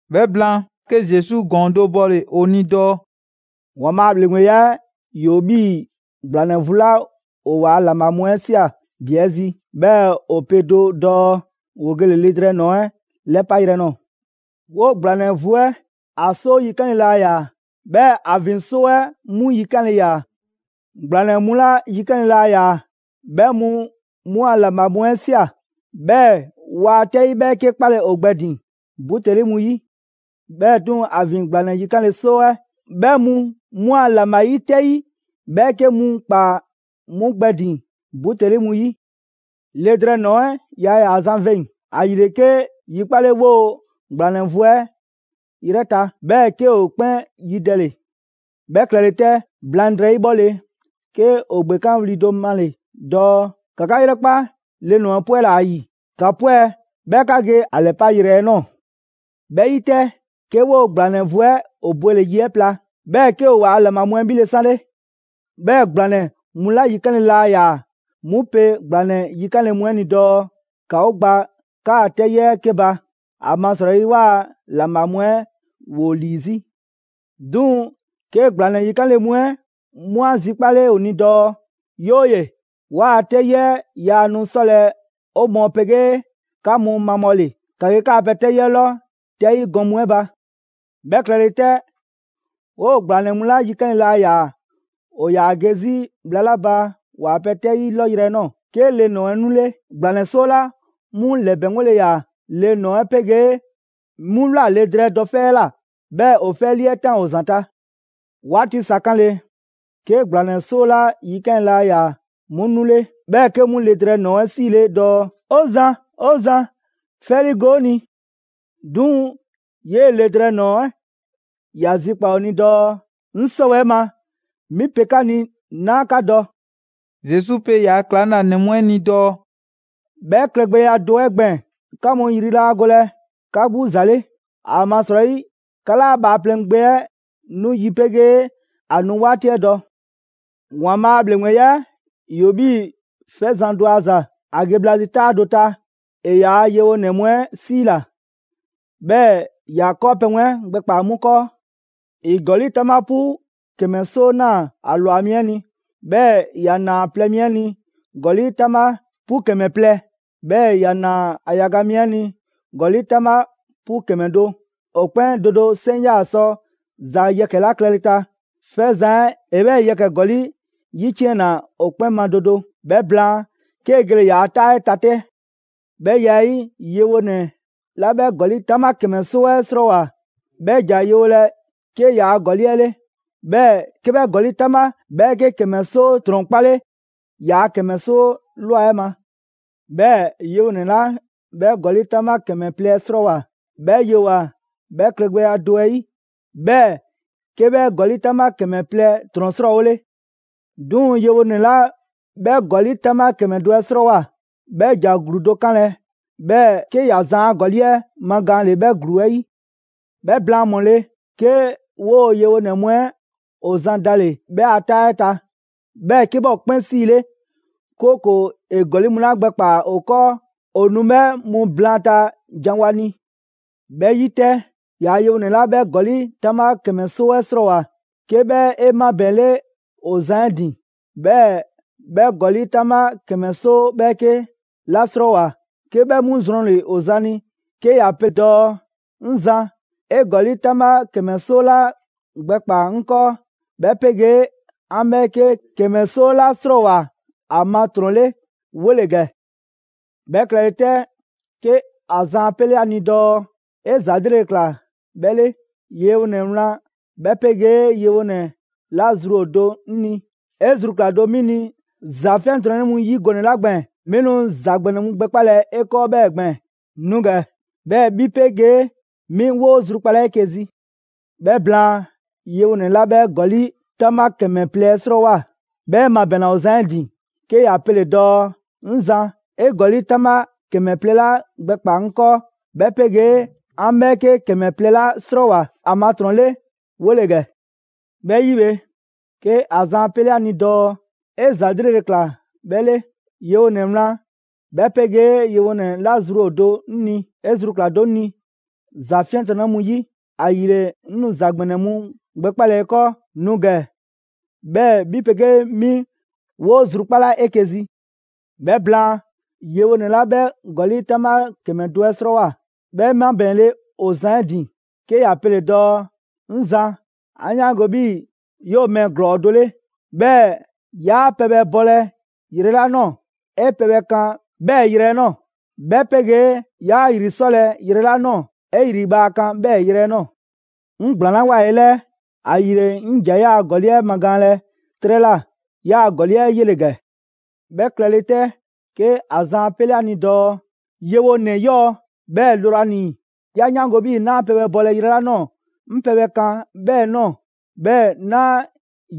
'Bhɛ blaan, 'ke Zesu ‑gɔɔn do bɔle‑ ‑o ni dɔɔ: «‑Waanbhaa' a ‑bhleŋgbeya 'ɛ ‑yoo 'bhii‑ ‑gblanɛ vu 'la ‑o ‑waa' ‑laŋbha mu 'ɛ ꞊sia ‑bi 'ɛ zi, 'bhɛɛ‑ ‑o pe do dɔɔ ‑woo gele‑ le drɛɛ ‑nɔɔ 'ɛ 'lɛpayrɛ ꞊nɔɔ. 'Woo‑ ‑gblanɛ vu 'ɛ, ‑a 'soo yikanle laa ‑yaa, 'bhɛɛ‑ ‑a ‑vin 'soo 'ɛ 'mu yikanle ‑yaa. ‑Gblanɛ mu 'la yikanle laa ‑yaa 'bhɛ mu 'mu a ‑laŋbha mu 'ɛ ꞊sia, 'bhɛɛ‑ waa 'tɛyi 'bhɛɛke 'kpalɛ‑ ‑o gbɛ ‑din buteli mu 'yi. 'Bhɛɛ‑ 'duŋ‑, ‑a ‑vin ‑gblanɛ yikanle 'soo 'ɛ 'bhɛ mu 'mu a ‑laŋbha 'yi 'tɛyi 'bhɛɛke mu ‑kpaa 'mu gbɛ ‑din buteli mu 'yi. Le drɛɛ ‑nɔɔ 'ɛ yaa ‑yaa zan veŋ‑, ‑ayile 'ke yi 'kpale 'woo‑ ‑gblanɛ vu 'ɛ 'yrɛ ta, 'bhɛɛ‑ 'ke ‑o 'kpɛn yidɛle.» «'Bhɛ klɛle 'tɛ, blaŋdrɛyi 'bhɔle‑, 'ke ‑o ‑gbekanwli do male‑ dɔɔ: ‹‑Ka 'ka 'yrɛkpa le ‑nɔɔ 'ɛ 'pwɛla‑ ‑a ‑yi! 'Ka 'pwɛ 'bhɛɛ‑ ‑ka ge ‑a ‑lɛpayrɛ 'ɛ nɔɔ‑!› 'Bhɛ 'yi 'tɛ, 'ke 'woo‑ ‑gblanɛ vu 'ɛ ‑o bwele‑ yi 'ɛ pla, 'bhɛɛ‑ 'ke ‑o ‑waa' ‑laŋbha mu 'ɛ 'bhile‑ 'sanle. 'Bhɛɛ‑ ‑gblanɛ mu 'la yikanle laa ‑yaa 'mu pe ‑gblanɛ yikanle mu 'ɛ ni dɔɔ: ‹‑Ka 'o gba 'kaa‑ 'tɛyi 'ɛ 'ke ba; ‑amasrɔyi 'waa‑ ‑laŋbha mu 'ɛ ‑woo ‑lii 'zi.› 'Duŋ‑, 'ke ‑gblanɛ yikanle mu 'ɛ 'mu 'a zikpale ‑o ni dɔɔ: ‹'Yooye‑, 'waa‑ 'tɛyi 'ɛ yaa nu 'sɔlɛ‑ 'o mɔɔ 'pegee 'ka mu mabhɔle. ‑Ka ge 'kaa‑ pɛ 'tɛyi 'lɔ 'tɛyi gɔn mu 'ɛ ba.› 'Bhɛ klɛle 'tɛ, 'woo‑ ‑gblanɛ mu 'la yikanle laa ‑yaa ‑o ‑yaa ge 'zi bhla 'la ba ‑waa' pɛ 'tɛyi 'lɔ yrɛ nɔɔ‑, 'ke le ‑nɔɔ 'ɛ 'nule. ‑Gblanɛ 'soo 'la 'mu ‑lɛbɛŋgole ‑yaa, le ‑nɔɔ 'ɛ 'pegee 'mu ꞊wlaa le drɛɛ dɔ 'fɛ 'ɛ ꞊la, 'bhɛɛ‑ ‑o 'fɛ 'ɛ 'lii 'ɛ ꞊taan ‑o ‑zanta'. 'Waati sa 'kanle, 'ke ‑gblanɛ 'soo 'la yikanle laa ‑yaa 'mu 'nule, 'bhɛɛ‑ 'ke 'mu le drɛɛ ‑nɔɔ 'ɛ 'siile dɔɔ: ‹'O zan, 'o zan, 'fɛ 'ɛ 'liigo‑ 'o ni!› 'Duŋ‑ 'yee‑ le drɛɛ nɔɔ‑ 'ɛ ‑ya zikpaa‑ ‑o ni dɔɔ: ‹'Ŋ 'sɔwɛɛ‑ ma 'mi pe 'ka ni 'naa 'ka dɔ!›» Zesu pe ‑yaa' ‑klaŋlanɛ mu 'ɛ ni dɔɔ: «'Bhɛ klɛgbɛya do 'ɛ gbɛɛn‑, 'ka mu ‑yri 'laa golɛ 'ka 'gbu ‑za 'le, ‑amasrɔyi 'ka 'laa Bhaaplɛŋ Gbe 'ɛ ‑a nu yi 'pegee ‑a nu 'waati 'ɛ dɔ.» «‑Waanbhaa' a ‑bhleŋgbeya 'ɛ ‑yoo 'bhii‑ 'fɛzan‑ do a ‑za. ‑A ge bhla zi 'taa do ta, ‑e ‑yaa' yewonɛ mu 'ɛ 'siila‑, 'bhɛɛ‑ ‑ya 'kɔɔpɛ‑ mu 'ɛ gbɛkpaa‑ 'mu 'kɔɔ. ‑E ‑gɔli' 'taŋbha 'pu ‑kɛmɛ 'soo ꞊naa ‑a ‑lwa mi 'ɛ ni. 'Bhɛɛ‑ ‑ya ‑naa ‑a plɛ mi 'ɛ ni ‑gɔli' 'taŋbha 'pu ‑kɛmɛ plɛ; 'bhɛɛ‑ ‑ya ‑naa ‑a yaga mi 'ɛ ni ‑gɔli' 'taŋbha 'pu ‑kɛmɛ do. ‑O 'kpɛn do do 'seŋ 'yaa‑ sɔ ‑za yɛkɛ‑ 'la klɛle ta, 'fɛzan‑ 'ɛ ‑e 'bhɛɛ‑ yɛkɛ‑ ‑gɔli' 'yiciɛnna ‑o 'kpɛn ma do do. 'Bhɛ blaan, 'kee‑ gele‑ ‑yaa' 'taa 'ɛ ta 'tɛ. 'Bhɛ ya 'ɛ 'yi, yewonɛ 'la 'bhɛ ‑gɔli' 'taŋbha ‑kɛmɛ 'soo 'ɛ 'srɔɔwoa‑, 'bhɛ ‑ja yewolɛ 'ke ‑yaa' ‑gɔli' 'ɛ 'le, 'bhɛɛ‑ 'ke 'bhɛ ‑gɔli' 'taŋbha 'bhɛɛke ‑kɛmɛ 'soo ‑trɔn 'kpale ‑yaa' ‑kɛmɛ 'soo ꞊lwa 'ɛ ma. 'Bhɛɛ‑ yewonɛ 'la 'bhɛ ‑gɔli' 'taŋbha ‑kɛmɛ plɛ 'ɛ 'srɔɔwoa‑, 'bhɛ yewoa‑ 'bhɛ klɛgbɛya do 'ɛ 'yi, 'bhɛɛ‑ 'ke 'bhɛ ‑gɔli' 'taŋbha ‑kɛmɛ plɛ ‑trɔn 'srɔɔwole. 'Duŋ‑, yewonɛ 'la 'bhɛ ‑gɔli' 'taŋbha ‑kɛmɛ do 'ɛ 'srɔɔwoa‑, 'bhɛ ‑ja ‑gluu do 'kanlɛ‑, 'bhɛɛ‑ 'ke ‑ya zan a ‑gɔli' 'ɛ magaanle 'bhɛ ‑gluu 'ɛ 'yi.» «'Bhɛ blaan ‑mɔle', 'ke 'woo‑ yewonɛ mu 'ɛ ‑o zan dale‑ 'bhɛ a 'taa 'ɛ ta; 'bhɛɛ‑ 'ke 'bhɛ ‑o 'kpɛn 'siile, 'kooko‑ ‑e ‑gɔli' mu 'la gbɛkpaa‑ ‑o ‑kɔɔ ‑o nu 'bhɛ mu blaanta janwo a ni. 'Bhɛ 'yi 'tɛ, ‑yaa' yewonɛ 'la 'bhɛ ‑gɔli' 'taŋbha ‑kɛmɛ 'soo 'ɛ 'srɔɔwoa‑, 'ke 'bhɛ 'e 'mabɛɛnle ‑o zan 'ɛ ‑din, 'bhɛɛ‑ 'bhɛ ‑gɔli' 'taŋbha ‑kɛmɛ 'soo 'bhɛɛke ꞊la 'srɔɔwoa‑, 'ke 'bhɛ 'mu zrɔnle‑ ‑o zan ni 'ke ‑ya pe dɔɔ: ‹'Ŋ Zan, 'e ‑gɔli' 'taŋbha ‑kɛmɛ 'soo 'la gbɛkpaa‑ 'ŋ 'kɔɔ 'bhɛ 'pegee 'an 'bhɛɛke ‑kɛmɛ 'soo 'la 'srɔɔwoa‑ ‑a ma ‑trɔn 'le 'wole‑ ‑gɛ.› 'Bhɛ klɛle 'tɛ, 'ke ‑a zan 'a 'pele 'a ni dɔɔ: ‹'E ‑za 'lrele‑ ꞊kla 'bhɛ 'le. Yewonɛ wlan 'bhɛ 'pegee yewonɛ 'la zru ‑o do 'ŋ ni. 'E zru ꞊kla do 'mi ni ‑za 'fiɛntrɔnnɛ mu yi gɔnɛ‑ 'la gbɛɛn‑, 'mi nu ‑za ‑gbɛnɛ mu gbɛkpalɛ 'e 'kɔɔ 'bhɛɛ‑ gbɛɛn‑. Nu ‑gɛ 'bhɛɛ‑ 'bhi 'pegee 'mi 'woo‑ zrukpala 'eke‑ zi.› 'Bhɛ blaan, yewonɛ 'la 'bhɛ ‑gɔli' 'taŋbha ‑kɛmɛ plɛ 'ɛ 'srɔɔwoa‑, 'bhɛ 'e ‑mabɛɛnle ‑o zan 'ɛ ‑din, 'ke ‑ya pele‑ dɔɔ: ‹'Ŋ zan, 'e ‑gɔli' 'taŋbha ‑kɛmɛ plɛ 'la gbɛkpaa‑ 'ŋ 'kɔɔ, 'bhɛ 'pegee 'an 'bhɛɛke ‑kɛmɛ plɛ 'la 'srɔɔwoa‑ ‑a ma ‑trɔn 'le 'wole‑ ‑gɛ.› 'Bhɛ 'yi bhe, 'ke ‑a zan 'a 'pele a ni dɔɔ: ‹'E ‑za 'lrele‑ ꞊kla 'bhɛ 'le. Yewonɛ wlan 'bhɛ 'pegee yewonɛ 'la zru ‑o do 'ŋ ni. 'E zru ꞊kla do 'ŋ ni ‑za 'fiɛntrɔnnɛ mu 'yi, ‑ayile 'ŋ nu ‑za ‑gbɛnɛ mu gbɛkpalɛ 'e 'kɔɔ. Nu ‑gɛ 'bhɛɛ‑ 'bhi 'pegee 'mi 'woo‑ zrukpala 'eke‑ zi.› 'Bhɛ blaan, yewonɛ 'la 'bhɛ ‑gɔli' 'taŋbha ‑kɛmɛ do 'ɛ 'srɔɔwoa‑, 'bhɛ 'e 'mabɛɛnle ‑o zan 'ɛ ‑din 'ke ‑ya pele‑ dɔɔ: ‹'Ŋ zan, 'an 'yaango‑ 'bhii‑ 'yoo‑ mɛɛ ‑glɔɔ do 'le, 'bhɛɛ‑ 'yaa pɛbhɛ bɔlɛ yrɛ 'la ꞊nɔɔ, 'e pɛbhɛ kan 'bhɛɛ‑ yrɛ 'ɛ ꞊nɔɔ; 'bhɛ 'pegee 'yaa ‑yri 'sɔlɛ‑ yrɛ 'la ꞊nɔɔ, 'e ‑yri bhaa kan 'bhɛɛ‑ yrɛ 'ɛ ꞊nɔɔ. 'Ŋ ‑gblaanlawoa 'e 'lɛɛ, ‑ayile 'ŋ ‑ja 'yaa‑ ‑gɔli' 'ɛ magaanlɛ 'trɛ ꞊la. 'Yaa‑ ‑gɔli' 'ɛ 'yele‑ ‑gɛ.› 'Bhɛ klɛle 'tɛ, 'ke ‑a zan 'a 'pele ‑a ni dɔɔ: ‹Yewonɛ 'yɔɔ‑, 'bhɛɛ‑ lrwanii‑. 'Ya 'yaango‑ 'bhii‑ 'naa pɛbhɛ bɔlɛ yrɛ 'la ꞊nɔɔ 'ŋ pɛbhɛ kan 'bhɛɛ‑ ꞊nɔɔ; 'bhɛɛ‑ 'naa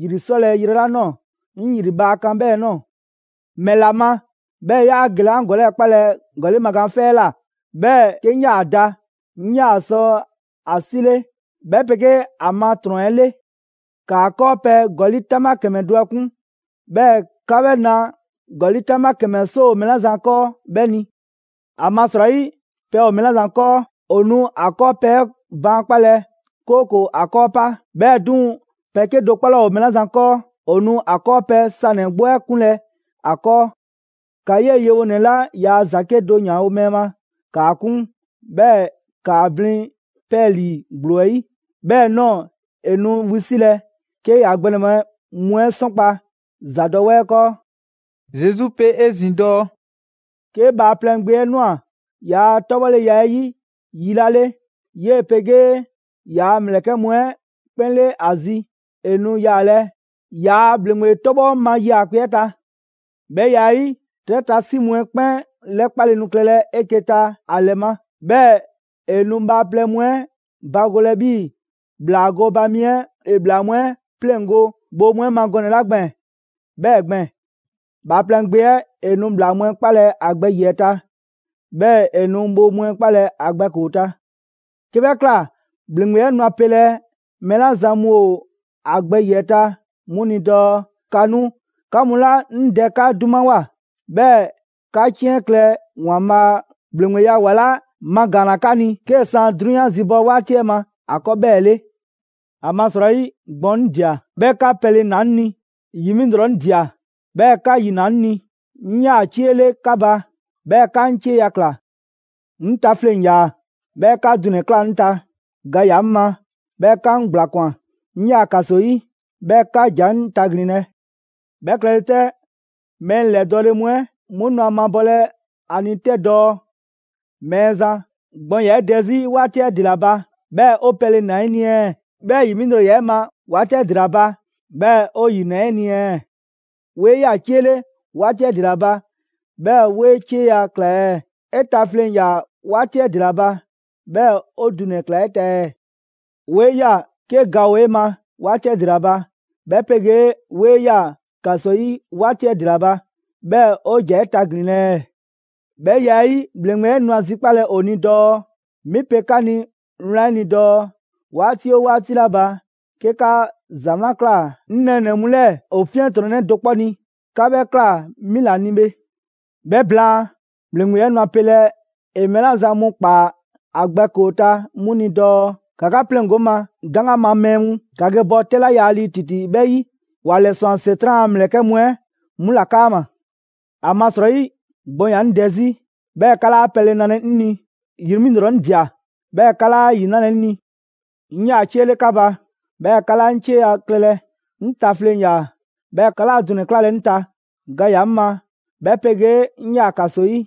‑yri 'sɔlɛ‑ yrɛ 'la ꞊nɔɔ 'ŋ ‑yri bhaa kan 'bhɛɛ‑ ꞊nɔɔ. ‑Mɛla ma 'bhɛɛ‑ 'yaa gelɛ 'an ‑gɔli' 'ɛ 'kpalɛ‑ ‑gɔli' magaan 'fɛ 'ɛ ꞊la, 'bhɛɛ‑ 'ke 'ŋ 'yaa‑ da, 'ŋ 'yaa‑ sɔ ‑a 'sile 'bhɛ 'pegee ‑a ma ‑trɔn 'ɛ 'le! ‑Kaa 'kɔɔpɛ‑ ‑gɔli' 'taŋbha ‑kɛmɛ do 'ɛ 'kun, 'bhɛɛ‑ ka 'bhɛ 'na ‑gɔli' 'taŋbha ‑kɛmɛ 'soo ‑o mɛɛ 'la zan ‑kɔɔ 'bhɛ ni. ‑Amasrɔyi, pɛ ‑o mɛɛ 'la zan 'kɔɔ, ‑o nu ‑a 'kɔɔpɛ‑ 'ɛ baankpalɛ, 'kooko‑ ‑a 'kɔɔ pa. 'Bhɛɛ‑ 'duŋ‑, pɛ 'kedo‑ 'kpɔ 'laa ‑o mɛɛ 'la zan 'kɔɔ, ‑o nu a 'kɔɔpɛ‑ sanɛ‑ 'gbu 'ɛ 'kunlɛ‑ a 'kɔɔ. ‑Ka 'yee‑ yewonɛ 'la yaa ‑za 'kedo‑ 'yanwo‑ mɛɛ ma, ‑kaa 'kun, 'bhɛɛ‑ ‑kaa blin 'pɛɛlii‑ ‑gblo 'ɛ 'yi. 'Bhɛɛ‑ ꞊nɔɔ, ‑e nu wisilɛ, 'ke ‑ya gbɛnɛbhɛ mu 'ɛ 'sɔnkpa‑ ‑zadɔwɛɛ 'ɛ 'kɔɔ.›» Zesu pe 'ezin‑ dɔɔ: «'Ke Bhaaplɛŋ Gbe 'ɛ ꞊nwa ‑yaa' 'tɔbhɔleya 'ɛ 'yi yi 'la 'le, 'yee‑ 'pegee ‑yaa' ‑mlɛkɛ' mu 'ɛ 'kpɛn 'le ‑a zi, ‑e nu yaalɛ ‑yaa' ‑bhleŋgbe 'tɔbhɔ ma 'yaakpe‑ 'ɛ ta. 'Bhɛ ya 'ɛ 'yi, 'trɛ ta 'si mu 'ɛ 'kpɛn 'lɛkpale nu klɛlɛ 'eke‑ ta ‑a ‑lɛ ma. 'Bhɛɛ‑ ‑e nu bhaaplɛŋ mu 'ɛ bagolɛ 'bhii‑ ‑bhlaa gooba mi 'ɛ ‑e ‑bhlaa mu 'ɛ 'pleŋgo‑ bhoo mu 'ɛ ma gɔnɛ‑ 'la gbɛɛn‑ 'bhɛɛ‑ gbɛɛn‑. Bhaaplɛŋ Gbe 'ɛ ‑e nu ‑bhlaa mu 'ɛ 'kpalɛ‑ ‑a gbɛ ‑yiɛ' ta, 'bhɛɛ‑ ‑e nu bhoo mu 'ɛ 'kpalɛ‑ ‑a gbɛ ‑koo ta. 'Ke 'bhɛ ꞊kla, ‑bhleŋgbe 'ɛ nu a pelɛ mɛɛ 'la zan mu ‑o ‑a gbɛ ‑yiɛ' ta 'mu ni dɔɔ: ‹‑Ka nu 'ka mu 'la 'ŋ Dɛ 'ka 'dumawoa. 'Bhɛɛ‑ 'ka 'ciɛn klɛ ‑Waanbhaa' ‑bhleŋgbeya ‑wa 'la magaanna 'ka ni, 'kee‑ san 'drunyan zibɔ 'waati 'ɛ ma ‑a 'kɔɔ 'bhɛɛ‑ 'le. ‑Amasrɔyi, gbɔn 'ŋ ꞊dia, 'bhɛɛ‑ 'ka pɛle ‑naa 'ŋ ni; ‑yi 'mi ‑lrɔ 'ŋ ꞊dia, 'bhɛɛ‑ 'ka ‑yi ‑naa 'ŋ ni, 'ŋ 'yaa‑ 'cie 'le 'ka ba, 'bhɛɛ‑ 'ka 'ŋ 'cieya‑ ꞊kla. 'Ŋ ta fleŋ‑ ‑yaa, 'bhɛɛ‑ 'ka dunɛ‑ ꞊klaa 'ŋ ta. Ga ‑yaa 'ŋ ma, 'bhɛɛ‑ 'ka 'ŋ ‑gblakwan. 'Ŋ 'yaa‑ ‑kaso 'yi 'bhɛɛ‑ 'ka ‑ja 'ŋ taglinlɛ.› 'Bhɛ klɛle 'tɛ, mɛɛ ‑lɛdɔɔle mu 'ɛ 'mu nu ‑a mabɔlɛ ‑a ni 'tɛ dɔɔ: ‹Mɛɛzan, gbɔn ‑yaa 'e dɛ 'zi 'waati 'ɛ ‑dela ba 'bhɛɛ‑ 'o pɛle ‑naa 'ɛ ni ɛɛ? 'Bhɛɛ‑ 'yi 'mi ‑lrɔ ‑yaa' 'e ma 'waati 'ɛ ‑dela ba, 'bhɛɛ‑ 'o ‑yi ‑naa 'e ni ɛɛ? 'Woo 'e ꞊ya 'cie 'le 'waati 'ɛ ‑dela ba, 'bhɛɛ‑ 'woo‑ 'e cieya‑ ꞊kla ɛɛ? 'E ta fleŋ‑ ‑yaa 'waati 'ɛ ‑dela ba, 'bhɛɛ‑ 'o dunɛ‑ ꞊klaa 'e ta ɛɛ? 'Woo 'e ꞊ya 'ke ga ‑o 'e ma 'waati 'ɛ ‑dela ba, 'bhɛ 'pegee 'woo‑ 'e ꞊ya ‑kaso 'yi 'waati 'ɛ ‑dela ba, 'bhɛɛ‑ 'o ‑ja 'e taglinlɛ ɛɛ?› 'Bhɛ ya 'ɛ 'yi, ‑bhleŋgbe 'ɛ nu ‑a zikpalɛ ‑o ni dɔɔ: ‹'Mi pe 'ka ni wlan 'ɛ ni dɔɔ: 'Waati 'oo 'waati 'la ba 'ke 'ka ‑za 'wlan ꞊kla 'ŋ nɛɛnɛ‑ mu 'lɛɛ‑ ‑o 'fiɛntrɔnnɛ do 'kpɔ ni, 'ka 'bhɛ ꞊kla 'mi ‑la ni bhe.› «'Bhɛ blaan, ‑bhleŋgbe 'ɛ nu a pelɛ ‑e mɛɛ 'la zan mu ‑kpaa ‑a gbɛ ‑koo ta 'mu ni dɔɔ: ‹‑Ka 'ka 'pleŋgo‑ 'ŋ ma, 'daŋgan ma mɛɛ mu! ‑Ka ge bɔ 'tɛ 'la yaa lii ‑titi 'bhɛ 'yi, ‑wa ‑lɛswan ‑Setran' a ‑mlɛkɛ' mu 'ɛ 'mu ‑la 'kaama‑. ‑Amasrɔyi, gbɔn ‑yaa 'ŋ dɛ 'zi, 'bhɛɛ‑ 'ka 'laa pɛle nalɛ 'ŋ ni; ‑yi 'mi ‑lrɔ 'ŋ ꞊dia, 'bhɛɛ‑ 'ka 'laa ‑yi 'nalɛ‑ 'ŋ ni. 'Ŋ 'yaa‑ 'cie 'le 'ka ba, 'bhɛɛ‑ 'ka 'laa 'ŋ 'cieya‑ klɛlɛ. 'Ŋ ta fleŋ‑ 'yaa‑, 'bhɛɛ‑ 'ka 'laa dunɛ‑ 'klalɛ‑ 'ŋ ta. Ga ‑yaa 'ŋ ma 'bhɛ 'pegee 'ŋ 'yaa‑ ‑kaso 'yi,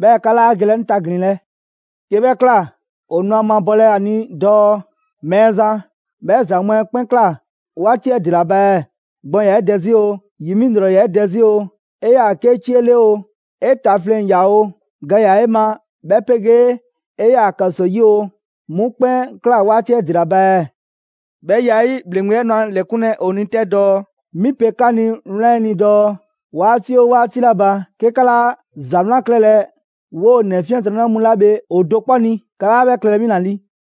'bhɛɛ‑ 'ka 'laa gelɛ 'ŋ taglinlɛ.› 'Ke 'bhɛ ꞊kla, ‑o nu a mabɔlɛ ‑a ni dɔɔ: ‹Mɛɛzan, 'bhɛ ‑za mu 'ɛ 'kpɛn ꞊kla 'waati 'ɛ ‑dela ba ɛɛ? Gbɔn ‑yaa 'e dɛ 'zi oo, ‑yi 'mi ‑lrɔ ‑yaa 'e dɛ 'zi oo, 'e 'yaa‑ 'ke 'cie 'le oo, 'e ta fleŋ‑ ‑yaa oo, ga ‑yaa 'e ma 'bhɛ 'pegee 'e 'yaa‑ ‑kaso 'yi oo, 'mu 'kpɛn ꞊kla 'waati 'ɛ ‑dela ba ɛɛ?› 'Bhɛ ya 'ɛ 'yi, ‑bhleŋgbe 'ɛ nu ‑a ‑lɛkunlɛ ‑o ni 'tɛ dɔɔ: ‹'Mi pe 'ka ni wlan 'ɛ ni dɔɔ: 'Waati 'oo 'waati 'la ba, 'ke 'ka 'laa ‑za 'wlan klɛlɛ 'woo‑ ‑nɛ 'fiɛntrɔnnɛ mu 'la bhe ‑o do 'kpɔ ni, 'ka 'laa 'bhɛ klɛlɛ 'mi ‑la ni.›